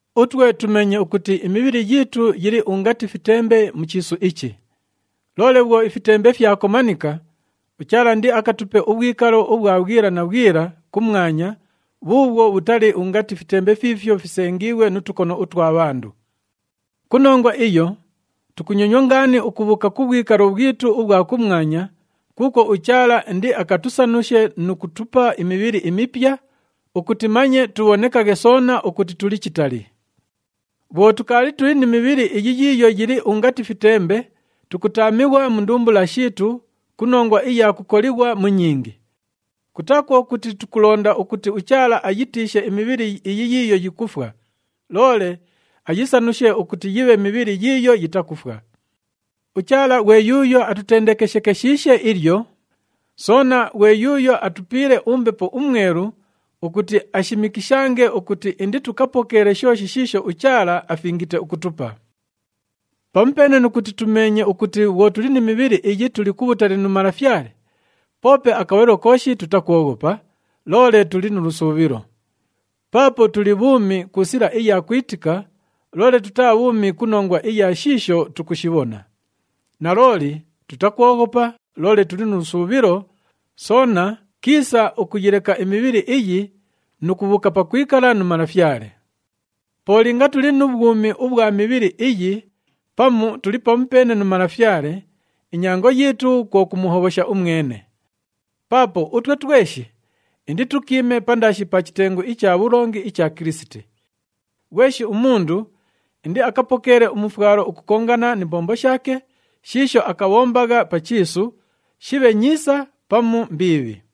Utwe tumeenye ukuti imibhili yiitu yili ungati fitembe mu chiisu ichi. Loole bhwo ifitembe fyakomanika, uChaala indiakatupe ubhwikalo ubhwa bhwila na bhwila kumwanya bhuubhwo bhutali ungati fitembe fiifyo fisengiighwe nu tukono utwa bhandu. Ku nongwa iyo tukunyonywa ngaani ukubhuuka ku bhwikalo bhwitu ubhwa kumwanya, kuukwo uChaala indiakatusanushe nu kutupa imibhili imipya ukuti manye tubhonekaghe soona ukuti tuli chitali. Bhwo tukaali tuli ni mibhili iyi yiiyo yili ungati fitembe, tukutaamighwa mu ndumbula shiitu ku nongwa iya kukolighwa mu nyingi. Kutaa kwo kuti tukulonda ukuti uChaala ayitiishe imibhili iyi yiiyo yikufwa, loole ayisanushe ukuti yibhe mibhili yiiyo yitakufwa. UChaala ghwe yuuyo atutendekeshekeshiishe ilyo, soona ghwe yuuyo atupiile uMbepo uMwelu ukuti ashimikishange ukuti inditukapokeele shooshi shiisho uChaala afingite ukutupa. Pamupeene nu kuti tumeenye ukuti bhwo tuli ni mibhili iyi tuli kubhutali nu Malafyale, poope akabhalilo kooshi tutakwoghopa, loole tuli nu lusuubhilo. Paapo tuli bhuumi ku sila iya kwitika, loole tutaa bhuumi ku nongwa iya shiisho tukushibhona. Nalooli tutakwoghopa loole tuli nu lusuubhilo, soona kiisa ukuyileka imibhili iyi nu kubhuuka pakwikala nu Malafyale. Po linga tuli mu bhwumi ubhwa mibhili iyi pamu tuli pamupeene nu Malafyale, inyango yiitu kwo kumuhobhosha umwene. Paapo utwe tweshi inditukiime pandaashi pa chitengu icha bhulongi icha Kilisiti. Ghweshi umundu indiakapokeele umufwalo ukukongana ni mbombo shaake shiisho akabhombagha pa chiisu, shibhe nyiisa pamu mbiibhi.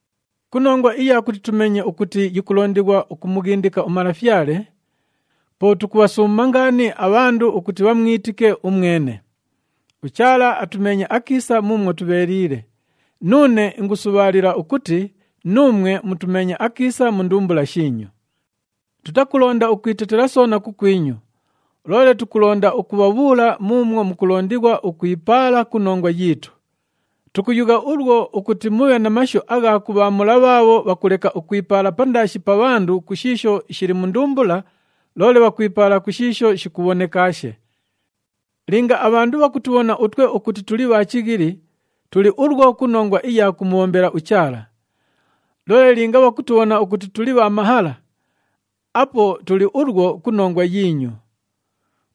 Ku nongwa iya kuti tumeenye ukuti yikulondighwa ukumughindika uMalafyale, po tukubhasuuma ngaani abhandu ukuti bhamwitike umwene. UChaala atumeenye akiisa muumwo tubheeliile, nuune ingusubhaalila ukuti nuumwe mutumeenye akiisa mu ndumbula shiinyu. Tutakulonda ukwitetela soona kukwinyu, loole tukulonda ukubhabhuula muumwo mukulondighwa ukwipaala ku nongwa yiitu. Tukuyugha ulwo ukuti mubhe na mashu agha kubhaamula bhaabho bhakuleka ukwipaala pandaashi pa bhandu ku shiisho shili mu ndumbula, loole bhakwipaala ku shiisho shikubhonekaashe. Linga abhandu bhakutubhona utwe ukuti tuli bha chighili, tuli ulwo ku nongwa iya kumubhombela uChaala. Loole linga bhakutubhona ukuti tuli bha mahala, apo tuli ulwo ku nongwa yiinyu.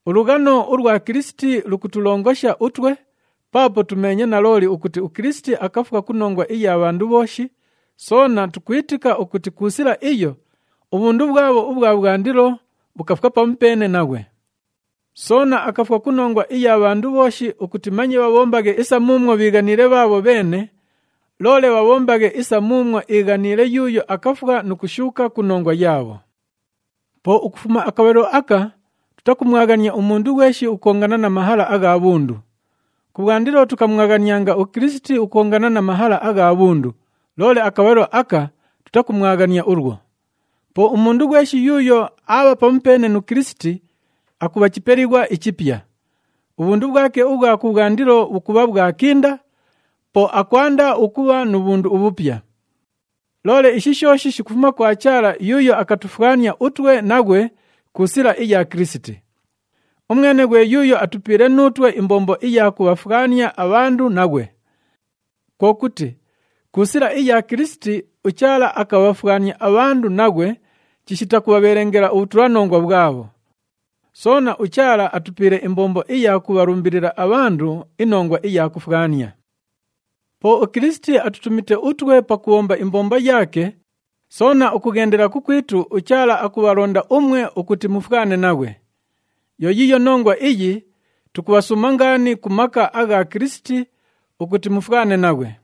Ulughano ulwa Kilisiti lukutulongosha utwe, paapo tumeenye nalooli ukuti uKilisiti akafwa ku nongwa iya bhandu bhooshi, soona tukwitika ukuti ku sila iyo, ubhundu bhwabho ubhwa bhwandilo bhukafwa pamupeene naghwe. Soona akafwa ku nongwa iya bhandu bhooshi ukuti manye bhabhombaghe isa muumwo bhiighaniile bhaabho bheene, loole bhabhombaghe isa muumwo iighaniile yuuyo akafwa nu kushuuka ku nongwa yaabho. Po ukufuma akabhalilo aka, tutakumwaghania umundu ghweshi ukukongana na mahala agha bhundu. Kubhwandilo tukamwaghanianga uKilisiti ukukongana na mahala agha bhundu, loole akabhalilo aka tutakumwaghania ulwo. Po umundu ghweshi yuuyo aabha pamupeene nu Kilisiti, akubha chipelighwa ichipya. Ubhundu bhwake ubhwa kubhwandilo bhukubha bhwakinda, po akwanda ukubha nu bhundu ubhupya! Loole ishi shooshi shikufuma kwa Chaala yuuyo akatufwania utwe naghwe ku sila iya Kilisiti. Umwene ghwe yuuyo atupiile nuutwe imbombo iya kubhafwania abhandu naghwe. Kwo kuti, ku sila iya Kilisiti, uChaala akabhafwania abhandu naghwe chishita kubhabhelengela ubhutulanongwa bhwabho. Soona, uChaala atupiile imbombo iya kubhalumbilila abhandu inongwa iya kufwania. Po uKilisiti atutumite utwe pakubhomba imbombo yaake, soona ukughendela kukwitu uChaala akubhalonda umwe ukuti mufwane naghwe. Yo yiiyo nongwa iyi tukubhasuuma ngaani ku maka agha Kilisiti ukuti mufwane naghwe.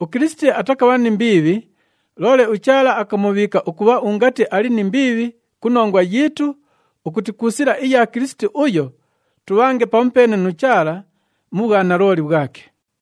UKilisiti atakabha ni mbiibhi, loole uChaala akamubhiika ukubha ungati ali ni mbiibhi ku nongwa yiitu ukuti ku sila iya Kilisiti uyo, tubhange pamupeene nu Chaala mu bhwanalooli bhwake.